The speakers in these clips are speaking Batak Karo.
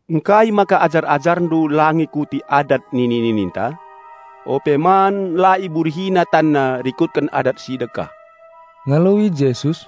"Ngkai maka ajar-AjarNdu la ngikuti adat nini-nininta? Ope man la iburihina tanna rikutken adat si dekah." Ngaloi Jesus,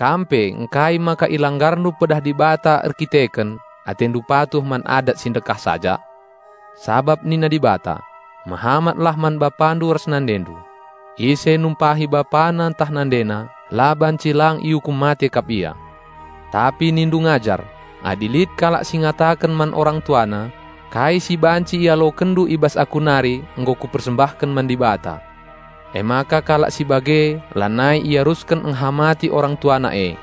"Kam pe ngkai maka ilanggarndu pedah Dibata erkiteken, atendu patuh man adat si ndekah saja? Sabap nina Dibata, 'Mehamatlah man bapandu ras nandendu.' Ise numpahi bapana ntah nandena la banci lang iukum mate kap ia. Tapi nindu ngajar: Adi lit kalak si ngataken man orang tuana, 'Kai si banci ialokenndu i bas aku nari nggo kupersembahken man Dibata,' emaka kalak si bage lanai iarusken enghamati orang tuana e.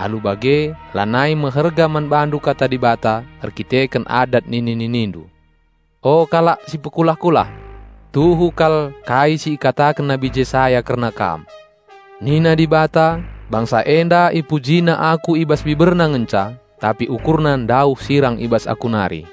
Alu bage lanai meherga man bandu Kata Dibata erkiteken adat nini-ninindu. O kalak si pekulah-kulah! Tuhu kal kai si ikataken Nabi Jesaya kerna kam, 'Nina Dibata, bangsa enda ipujina Aku i bas biberna ngenca, tapi ukurna ndauh sirang i bas Aku nari.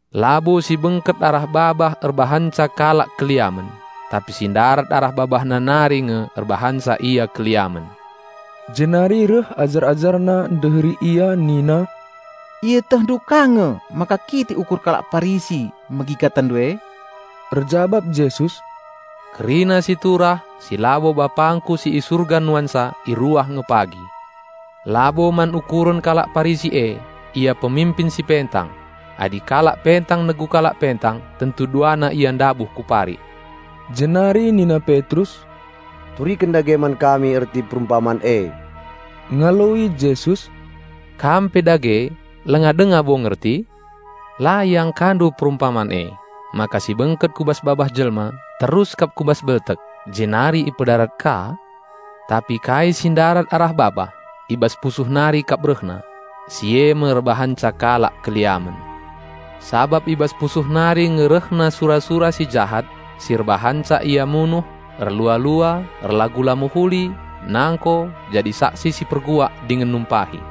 Labo si bengket arah babah erbahanca kalak erdosa, tapi si ndarat arah babahna nari nge erbahanca ia erdosa." Jenari reh ajar-AjarNa ndeheri Ia nina, "IetehNdu ka nge maka kitik ukur kalak Parisi megi KataNdu e?" Erjabap Jesus, "Kerina si turah, si labo BapangKu si i Surga nuansa iruah nge pagi. Labo man ukuren kalak Parisi e. Ia peminpin si pentang. Adi kalak pentang negu kalak pentang tentu duana ia ndabuh ku parik." Jenari nina Petrus, "Turiken dage man kami erti perumpaman e." Ngaloi Jesus, "Kam pe dage langa denga bo ngerti? La iangkandu perumpaman e, maka si bengket ku bas babah jelma terus kap ku bas beltek jenari ipedarat ka? Tapi kai si ndarat arah babah, i bas pusuh nari kap rehna; si e me erbahanca kalak erdosa. Sabap i bas pusuh nari nge rehna sura-sura si jahat, si erbahanca ia munuh, erlua-lua, erlagu la mehuli, nangko, jadi saksi si perguak dingen numpahi.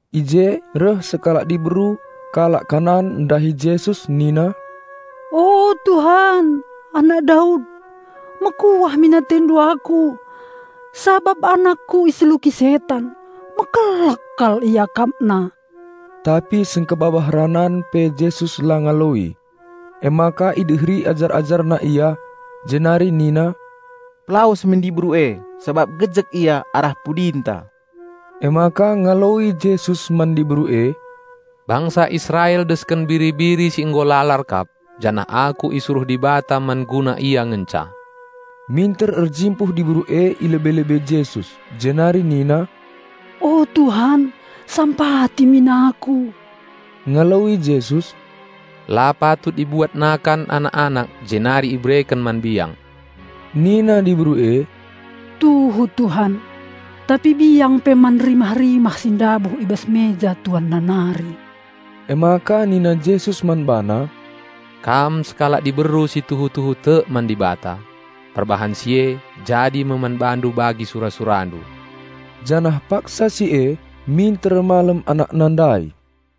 I je reh sekalak diberu kalak Kanaan ndahi Jesus nina, "O Bapa, Anak Daud! Mekuah min AteNdu aku sabap anakku iseluki setan. Mekelek kal iakapna." Tapi sengkebabah ranan pe Jesus la ngaloi. Emaka ideheri ajar-AjarNa ia, jenari nina, "Pelawes min diberu e, sabap gejek ia arah pudinta." Emaka ngaloi Jesus man diberu e, "Bangsa Israel desken biri-biri si nggo lalar kap, janah Aku isuruh Dibata man guna ia ngenca." Minter erjimpuh diberu e i lebe-lebe Jesus, jenari nina, "O Bapa sampati min aku!" Ngaloi Jesus, "La patut ibuat nakan anak-anak jenari ibereken man biang." Nina diberu e, "Tuhu Bapa, tapi biang pe man rimah-rimah si ndabuh i bas meja tuanna nari." Emaka nina Jesus man bana, "Kam sekalak diberu si tuhu-tuhu tek man Dibata. Perbahan si e jadi me man bandu bagi sura-surandu." Janah paksa si e minter malem anakna ndai.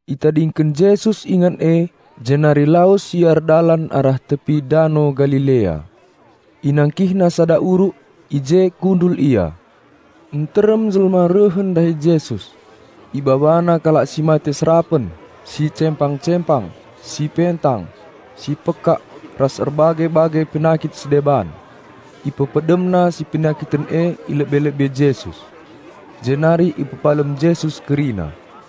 Itadingken Jesus ingan e, jenari lawes Ia erdalan arah tepi dano Galilea. InangkihNa sada uruk, i je kundul Ia. Nterem jelma rehen ndahi Jesus; ibabana kalak si mate serapen, si cempang-cempang, si pentang, si pekak ras erbage-bage penakit si deban. Ipepedemna si penakiten e i lebe-lebe Jesus. Jenari ipepalem Jesus kerina.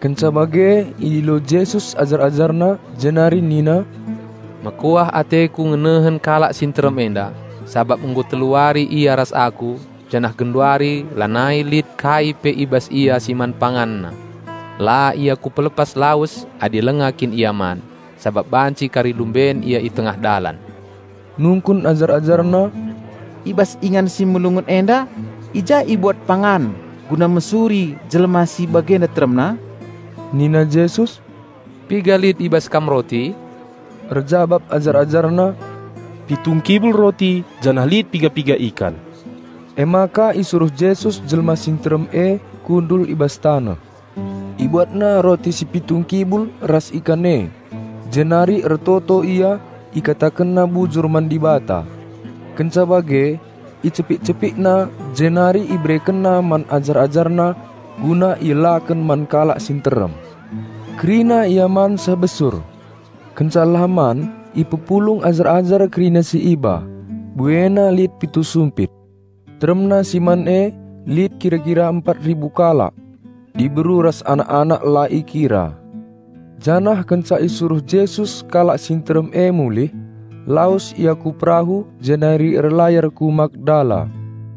Kenca bage idilo Jesus ajar-AjarNa jenari nina, "Mekuah ateKu ngenehen kalak si nterem enda, sabap nggo telu wari ia ras Aku janah genduari lanai lit kai pe i bas ia si man panganna. La ia Kupelepas lawes adi langa kin ia man, sabap banci kari lumben ia i tengah dalan." Nungkun ajar-AjarNa, "I bas ingan si melungun enda i ja ibuat pangan guna mesuri jelma si bagenda teremna?" Nina Jesus, "Piga lit i bas kam roti?" Erjabap ajar-AjarNa, "Pitu ngkibul roti janah lit piga-piga ikan." Emaka isuruh Jesus jelma si nterem e kundul i bas taneh. IbuatNa roti si pitu ngkibul ras ikan e, jenari ertoto Ia IkatakenNa bujur man Dibata. Kenca bage icepik-CepikNa, jenari IberekenNa man ajar-AjarNa guna ielaken man kalak si nterem. Kerina ia man seh besur. Kenca elah man ipepulung ajar-ajar kerina si iba, buena lit pitu sumpit. Teremna si man e lit kira-kira empat ribu kalak, diberu ras anak-anak la ikira. Janah kenca isuruh Jesus kalak si nterem e mulih, lawes Ia ku perahu jenari erlayar ku Magdala.